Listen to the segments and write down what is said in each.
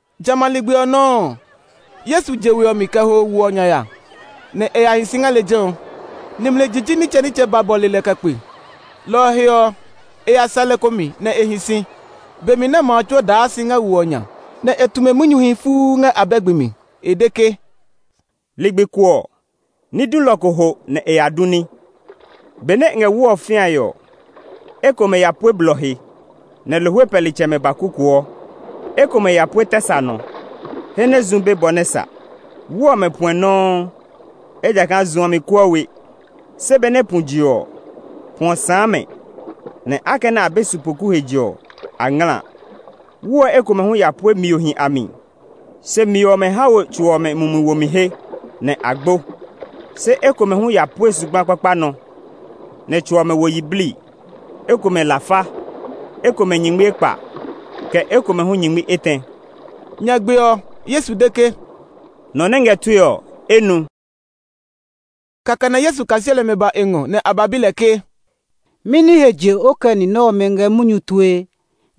Jamɛ a ligbi ɔ nɔuu ɔ, Yesu je we ɔ mi kɛ ho wo ɔ nya ya, nɛ e ya hi si ngɛ lejɛ ɔ. Nimli jiji nitsɛnitsɛ ba bɔle lɛ kɛ kpe. Lɔ ɔ he ɔ, e ya sɛ lɛ ko mi nɛ e hi si, be mi nɛ ma a tsuo daa si ngɛ wo ɔ nya. Nɛ e tu mɛ munyuhi fuu ngɛ abɛ gbi mi. E de ke, “Ligbi ko ɔ, ní dulɔ ko ho nɛ e ya du ní. Benɛ e ngɛ wu ɔ fĩae ɔ, ekomɛ ya pue blɔ he, nɛ lohwe pɛlitsɛmɛ ba kukuɔ. Ekomɛ ya pue tɛ sa nɔ, he nɛ zu be bɔ nɛ sa. Wu ɔmɛ puɛ nɔuu, ejakaa zu ɔ mi kuɔ we. Se benɛ pu je ɔ, pu ɔ sãã mɛ, nɛ akɛnɛ a be sipoku he je ɔ, a ngla. Wu ɔ ekomɛ hu ya pue miohi a mi; se mio ɔmɛ ha we tso ɔmɛ mumi womi he, nɛ a gbo. Se ekomɛ hu ya pue zugba kpakpa nɔ, nɛ tso ɔmɛ wo yiblii, ekomɛ lafa, ekomɛ nyingmi ekpa, kɛ ekomɛ hu nyingmi etɛ.” Nyagbe ɔ, Yesu de ke, “Nɔ nɛ ngɛ tue ɔ, e nu.” Kɛkɛ nɛ Yesu kaseli ɔmɛ ba e ngɔ, nɛ a ba bi lɛ ke, “Mɛni he je o kɛ ni ɔmɛ ngɛ munyu tue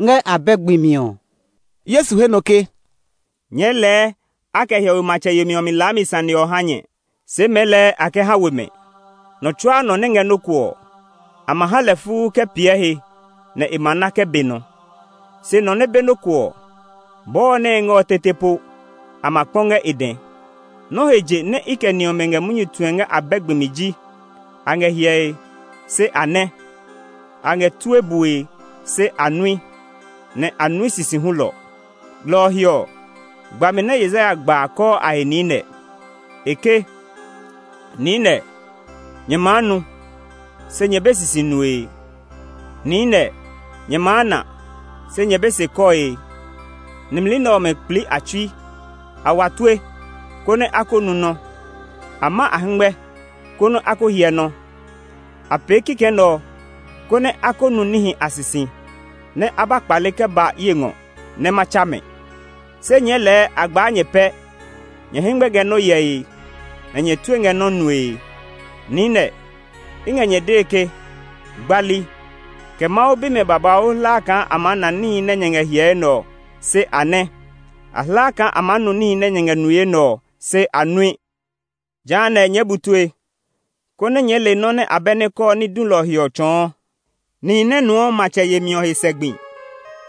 ngɛ abɛ gbi mi ɔ?” Yesu he nɔ ke, “Nyɛɛ lɛɛ a kɛ hiɔwe matsɛ yemi ɔ mi laami sane ɔ ha nyɛ; se mɛɛ a kɛ ha we mɛ. Nɔ tsuaa nɔ nɛ ngɛ nɔ́ ko ɔ, a ma ha lɛ fuu kɛ piɛ he nɛ e na kɛ be nɔ. Se nɔ nɛ be nɔ́ ko ɔ, bɔɔ nɛ e ngɛ ɔ tete po, a ma kpɔ ngɛ e dɛ. Nɔ́ he je nɛ i kɛ ni ɔmɛ ngɛ munyu tue ngɛ abɛ gbi mi ji: a ngɛ hyɛe, se a nɛ; a ngɛ tue bue, se a nui, nɛ a nui sisi hulɔ. Lɔ ɔ he ɔ, gbami nɛ Yesaya gba a kɔɔ a he niinɛ. E ke, ‘Niinɛ, nyɛ maa nu, se nyɛ be sisi nue. Niinɛ, nyɛ maa na, se nyɛ be se kɔe. Nimli nɛ ɔmɛ kplii a tsui; A wa tue, konɛ a ko nu nɔ́. A ma a hɛngmɛ, konɛ a ko hyɛ nɔ́. A pee kikɛ nɛ ɔ, konɛ a ko nu níhi a sisi; nɛ a ba kpale kɛ ba ye ngɔ nɛ ma tsa mɛ.’ “Se nyɛɛ lɛɛ a gbaa nyɛ pɛ! Nyɛ hɛngmɛ ngɛ nɔ́ hyɛe, nɛ nyɛ tue ngɛ nɔ́ nue. Niinɛ, i ngɛ nyɛ dee ke gbali, kɛ Mawu bimɛ babauu hla kaa a maa na níhi nɛ nyɛ ngɛ hyɛe nɛ ɔ, se a nɛ́; a hla kaa a maa nu níhi nɛ nyɛ ngɛ nue nɛ ɔ, se a nui. “Jehanɛ, nyɛɛ bu tue, konɛ nyɛɛ le nɔ nɛ abɛ nɛ kɔɔ ní dulɔ ɔ he ɔ tsɔɔ. Nihi nɛ nuɔ matsɛ yemi ɔ he sɛ gbi,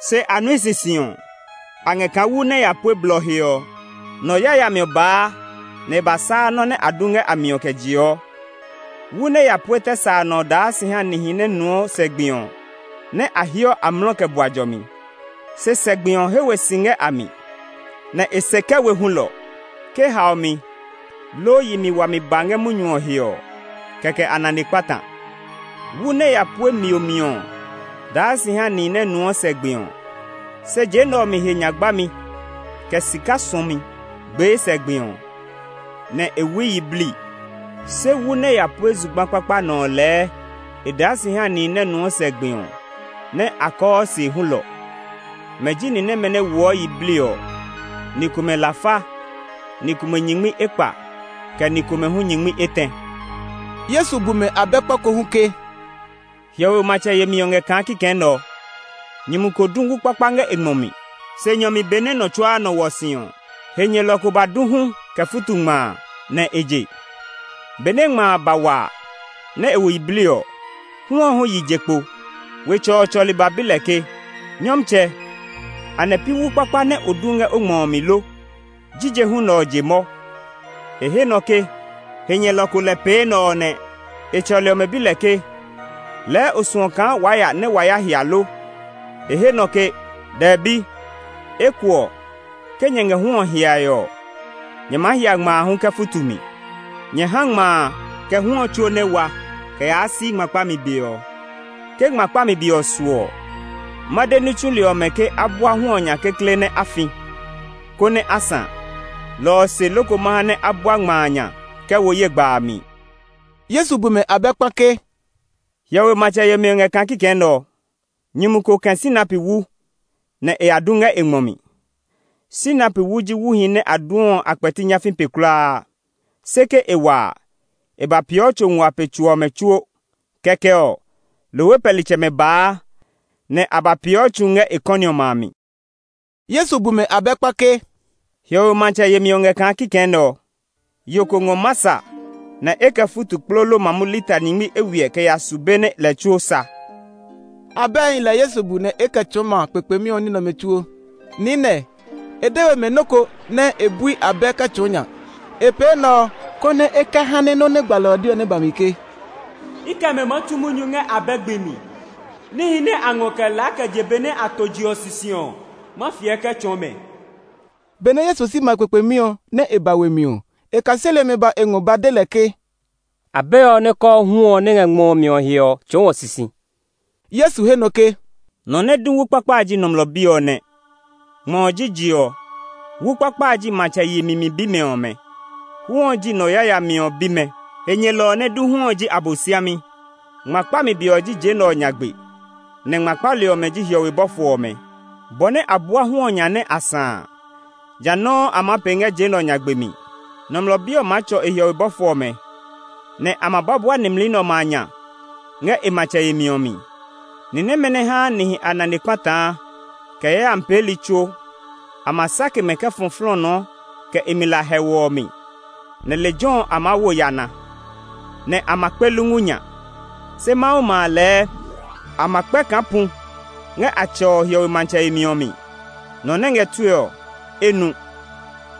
se a nui sisi ɔ, a ngɛ kaa wu nɛ ya pue blɔ he ɔ. Nɔ yayami ɔ baa nɛ e ba saa nɔ́ nɛ a du ngɛ a mi ɔ kɛ jeɔ. Wu nɛ ya pue tɛ sa nɔ ɔ daa si ha nihi nɛ nuɔ sɛ gbi ɔ, nɛ a heɔ amlɔ kɛ bua jɔmi. Se sɛ gbi ɔ he we si ngɛ a mi, nɛ e se kɛ we hulɔ. Ke haomi, loo yi wami ba ngɛ munyu ɔ he ɔ, kɛkɛ a nane kpata. Wu nɛ ya pue mio mi ɔ daa si ha nihi nɛ nuɔ sɛ gbi ɔ, se je nɛ ɔ mi he nya gbami, kɛ sika suɔmi gbee sɛ gbi ɔ, nɛ e wui yiblii. Se wu nɛ ya pue zugba kpakpa nɔ ɔ lɛɛ e daa si ha nihi nɛ nuɔ sɛ gbi ɔ, nɛ a kɔɔ se hulɔ. Mɛ ji ni nɛmɛ nɛ woɔ yiblii ɔ, ni komɛ lafa, ni komɛ nyingmi ekpa, kɛ ni komɛ hu nyingmi etɛ.” Yesu bu mɛ abɛ kpa ko hu ke, “Hiɔwe matsɛ yemi ɔ ngɛ kaa kikɛ nɛ ɔ. Nyumu ko du wu kpakpa ngɛ e ngmɔ mi. Se nyɔ mi benɛ nɔ tsuaa nɔ hwɔ si ɔ, he nyɛlɔ ko ba du hu kɛ futu ngma a, nɛ e je. Benɛ ngma a ba wa nɛ e wo yiblii ɔ, hu ɔ hu yi je kpo. Wetsɛ ɔ tsɔli ba bi lɛ ke, ‘Nyɔmtsɛ, anɛ pi wu kpakpa nɛ o du ngɛ o ngmɔ ɔ mi lo? Jije hu nɛ ɔ je mɔ?’ E he nɔ ke, ‘He nyɛlɔ ko lɛ pee enɛ ɔ nɛ.’ E tsɔli ɔmɛ bi lɛ ke, ‘Lɛɛ o suɔ kaa waa ya nɛ wa ya hia lo?’ E he nɔ ke, ‘Dɛbi, eko ɔ, ke nyɛ ngɛ hu ɔ hiae ɔ, nyɛ maa hia ngma a hu kɛ futu mi. Nyɛ ha ngma a, kɛ hu ɔ tsuo nɛ wa kɛ yaa si ngma kpami be ɔ. Ke ngma kpami be ɔ su ɔ, ma de ní tsuli ɔmɛ ke a bua hu ɔ nya kekle nɛ a fi, konɛ a sã. Lɔ ɔ se loko ma ha nɛ a bua ngma a nya kɛ wo ye gba a mi.’” Yesu bu mɛ abɛ kpa ke, “Hiɔwe matsɛ yemi ɔ ngɛ kaa kikɛ nɛ ɔ: Nyumu ko kɛ̃ sinapi wu, nɛ e ya du ngɛ e ngmɔ mi. Sinapi wu ji wuhi nɛ a duɔ ɔ a kpɛti nyafii pe kulaa. Se ke e wa a, e ba peeɔ tso nguaa pe tso ɔmɛ tsuo. Kɛkɛ ɔ, lohwe pɛlitsɛmɛ baa nɛ a ba peeɔ tsu ngɛ e kɔni ɔmɛ a mi.” Yesu bu mɛ abɛ kpa ke, “Hiɔwe matsɛ yemi ɔ ngɛ kaa kikɛ nɛ ɔ: Yo ko ngɔ masa nɛ e kɛ futu kplolo mamu lita nyingmi eywiɛ kɛ ya su be nɛ lɛ tsuo fu.” Abɛhi lɛ Yesu bu nɛ e kɛ tsɔɔ ma kpekpemi ɔ ní nɛ ɔmɛ tsuo. Niinɛ, e de we mɛ nɔ́ ko nɛ e bui abɛ kɛ tsɔɔ nya. E pee enɛ ɔ, konɛ e kɛ ha nɛ nɔ́ nɛ gbalɔ ɔ de ɔ nɛ ba mi ke, “I kɛ mɛ maa tu munyu ngɛ abɛ gbi mi. Níhi nɛ a ngɔ kɛ laa kɛ je be nɛ a to je ɔ sisi ɔ, ma fiɛ kɛ tsɔɔ mɛ.” Benɛ Yesu si ma kpekpemi ɔ, nɛ e ba we mi ɔ, e kaseli ɔmɛ ba e ngɔ ba de lɛ ke, “Abɛ ɔ nɛ kɔɔ hu ɔ nɛ ngɛ ngmɔ ɔ mi ɔ he ɔ, tsɔɔ wɔ sisi.” Yesu he nɔ ke, “Nɔ nɛ du wu kpakpa a ji Nɔmlɔ Bi ɔ nɛ. Ngmɔ ɔ ji je ɔ; wu kpakpa a ji matsɛ yemi mi bimɛ ɔmɛ; hu ɔ ji nɔ yayami ɔ bimɛ. He nyɛlɔ ɔ nɛ du hu ɔ ji Abosiami. Ngma kpami be ɔ ji je nɛ ɔ nyagbe, nɛ ngma kpali ɔmɛ ji hiɔwe bɔfo ɔmɛ. Bɔ nɛ a bua hu ɔ nya nɛ a sã a, jã nɔuu a maa pee ngɛ je nɛ ɔ nyagbe mi. Nɔmlɔ Bi ɔ maa tsɔ e hiɔwe bɔfo ɔmɛ, nɛ a ma ba bua nimli nɛ ɔmɛ a nya ngɛ e matsɛ yemi ɔ mi: ni nɛmɛ nɛ haa nihi a nane kpataa, kɛ yayami peeli tsuo. A ma sake mɛ kɛ fɔ flɔɔnɔɔ kɛ e mi la hɛuu ɔ mi; nɛ lejɛ ɔ a maa wo yana, nɛ a ma kpe lungu nya. Se Mawu ma a lɛɛ, a ma kpɛ kaa pu ngɛ a Tsɛ ɔ hiɔwe matsɛ yemi ɔ mi. Nɔ nɛ ngɛ tue ɔ, e nu!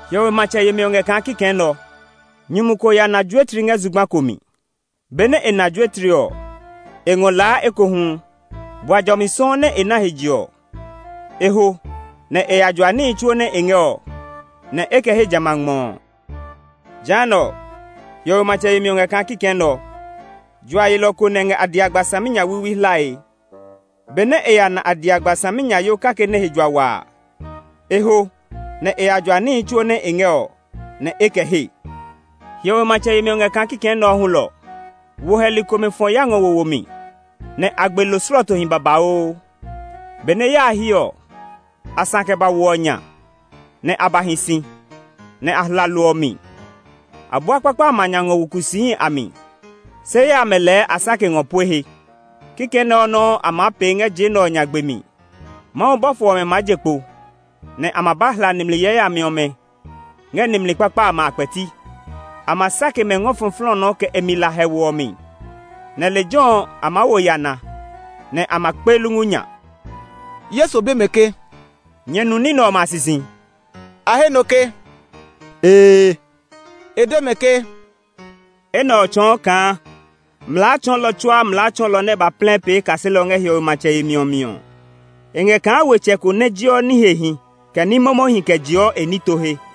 “Hiɔwe matsɛ yemi ɔ ngɛ kaa kikɛ nɛ ɔ: Nyumu ko ya na juetli ngɛ zugba ko mi. Benɛ e na juetli ɔ, e ngɔ laa ekohu. Bua jɔmi sɔuu nɛ e na he je ɔ, e ho nɛ e ya jua níhi tsuo nɛ e ngɛ ɔ, nɛ e kɛ he jamɛ a ngmɔ ɔ. “Jehanɛ ɔ, hiɔwe matsɛ yemi ɔ ngɛ kaa kikɛ nɛ ɔ: Jua yelɔ ko lɛ ngɛ adiagba saminyawiiwi hlae. Benɛ e ya na adiagba saminyayoo kake nɛ he jua wa a, e ho nɛ e ya jua níhi tsuo nɛ e ngɛ ɔ, nɛ e kɛ he. “Hiɔwe matsɛ yemi ɔ ngɛ kaa kikɛ nɛ ɔ hulɔ. Wo hɛli komɛ fɔ ya ngɛ wo mi, nɛ a gbe lo slɔɔtohi babauu. Benɛ ya a hyi ɔ, a sã kɛ ba wo ɔ nya, nɛ a ba hi si, nɛ a hla lo ɔ mi. A bua kpakpa amɛ a nya ngɔ wo kusiihi a mi, se yaya amɛ lɛɛ a sake ngɔ pue he. Kikɛ nɛ ɔ nɔuu a maa pee ngɛ je nɛ ɔ nyagbe mi. Mawu bɔfo ɔmɛ maa je kpo, nɛ a ma ba hla nimli yayami ɔmɛ ngɛ nimli kpakpa amɛ a kpɛti. A ma sake mɛ ngɔ fɔ flɔɔnɔɔ kɛ e mi la hɛuu ɔ mi; nɛ lejɛ ɔ, a maa wo yana, nɛ a ma kpe lungu nya.” Yesu bi mɛ ke, “Nyɛ nu ní nɛ ɔmɛ a sisi?” A he nɔ ke, “Ee.” E de mɛ ke, “Enɛ ɔ tsɔɔ kaa mlaa tsɔɔlɔ tsuaa mlaa tsɔɔlɔ nɛ ba plɛ pee kaselɔ ngɛ hiɔwe matsɛ yemi ɔ mi ɔ, e ngɛ kaa wetsɛ ko nɛ jeɔ ní hehi, kɛ ní momohi kɛ jeɔ e nito he.”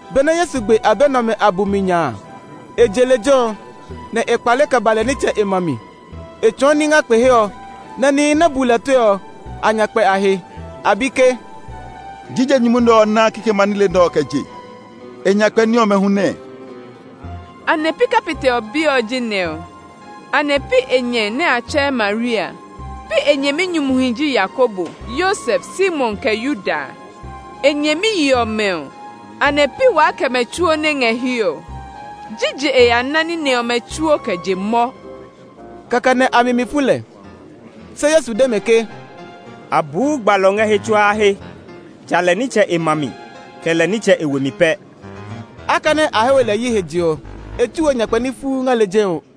Benɛ Yesu gbe abɛ nɛ ɔmɛ a bumi nya a, e je lejɛ ɔ, nɛ e kpale kɛ ba lɛ nitsɛ e ma mi. E tsɔɔ ní ngɛ kpe he ɔ, nɛ nihi nɛ bu lɛ tue ɔ, a nya kpɛ a he. A bi ke, “Jije nyumu nɛ ɔ ná kikɛmɛ a nile nɛ ɔ kɛ je? E nyakpɛ ní ɔmɛ hu nɛɛ? Anɛ pi kapitɛ ɔ bi ɔ ji nɛ ɔ? Anɛ pi e nyɛ nɛ a tsɛɛ Maria a? Pi e nyɛminyumuhi ji Yakobo, Yosef, Simon, kɛ Yuda a? E nyɛmiyi ɔmɛ ɔ, anɛ pi waa kɛ mɛ tsuo nɛ ngɛ hiɛ ɔ? Jije e ya ná ní nɛ ɔmɛ tsuo kɛ je mɔ?” Kɛkɛ nɛ a mi mi fu lɛ. Se Yesu de mɛ ke, “A buu gbalɔ ngɛ he tsuaa he, ja lɛ nitsɛ e ma mi, kɛ lɛ nitsɛ e we mi pɛ.” Akɛnɛ a he we lɛ yi he je ɔ, e tsu we nyakpɛ ní fuu ngɛ lejɛ ɔ.